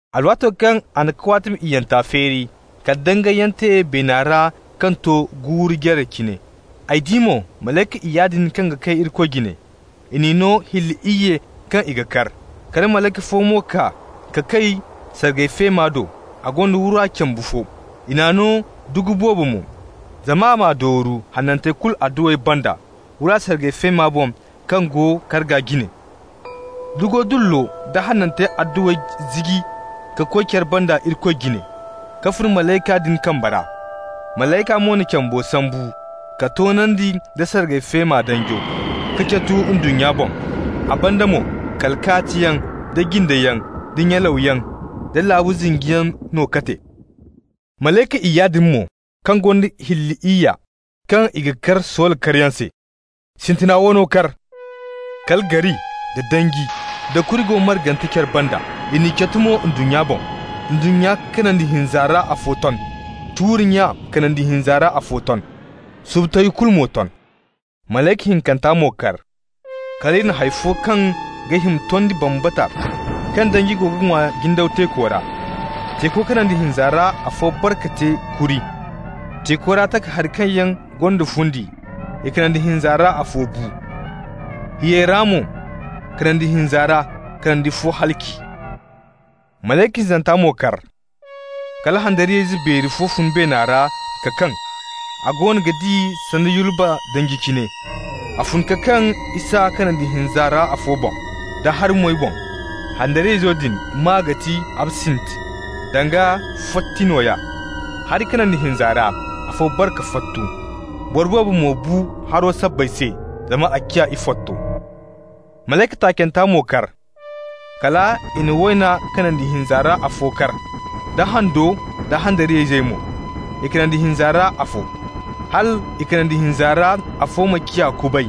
Alwaato kaŋ a na kawaatimi iyyanta feeri, kal dangayyaŋ te beena ra kaŋ to guuru jare cine. Ay di mo malayka iyya din kaŋ ga kay Irikoy jine. I n'i no hilli iyye kaŋ i ga kar. Kala malayka fo mo kaa ka kay sargay feema do, a gonda wura cambu fo. I n'a no dugu boobo mo, zama a m'a dooru hanantey kulu adduwey banda wura sargay feema boŋ kaŋ go karga jine. Dugo dullo da hanantey adduwey ziji ka koy care banda Irikoy jine, ka fun malayka din kamba ra. Malayka mo na cambo sambu k'a toonandi nda sargay feema danjo, k'a catu ndunnya boŋ. A banda mo kala kaatiyaŋ, da jindeyaŋ, da nyalawyaŋ, da laabu zinjiyaŋ no ka te. Malayka iyya din mo kaŋ gonda hilli iyya kaŋ i ga kar soola karyaŋ se. Sintina wano kar. Kala gari, da danji da kuri go margante care banda, i n'i catu mo ndunnya boŋ. Ndunnya kanandi hinza ra afo ton. Tuuri nya kanandi hinza ra afo ton, subu tayo kulu mo ton. Malayka hinkanta mo kar. Kal i na hay fo kaŋ ga hima tondi bambata kaŋ danji go ga ŋwa jindaw teeko ra. Teeko kanandi hinza ra afo bare ka te kuri. Teeko ra takahari kaŋ yaŋ gonda fundi, i kanandi hinza ra afo bu. Hiyey ra mo kanandi hinza ra, kanandi fo halaci. Malayka hinzanta mo kar. Kala handariyayze beeri fo fun beena ra ka kaŋ. A goono ga di sanda yulba danji cine. A fun ka kaŋ isa kanandi hinza ra afo boŋ, da hari-moy boŋ. Handariyayzo din maa ga ti Absint, (danga fotti nooya). Hari kanandi hinza ra afo bare ka fottu, boro boobo mo bu haro sabbay se, zama a ciya ifotto. Malayka taacanta mo kar. Kal i na wayna kanandi hinza ra afo kar, da hando da handariyayzey mo, i kanandi hinza ra afo. Hal i kanandi hinza ra afo ma ciya kubay,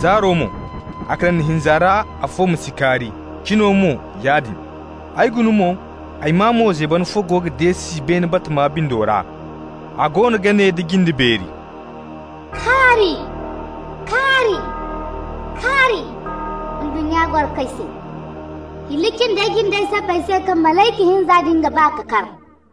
zaaro mo, a kanandi hinza ra afo ma si kaari, cino mo yaadin. Ay guna mo, ay maa mo zeeban fo goono ga deesi beene batama bindo ra. A goono ga ne nda jinde beeri: «Kaari, kaari, kaari! ndunnya gorokoy se, hilli cindey jindey sabbay se kaŋ malayka hinza din ga ba ka kar.»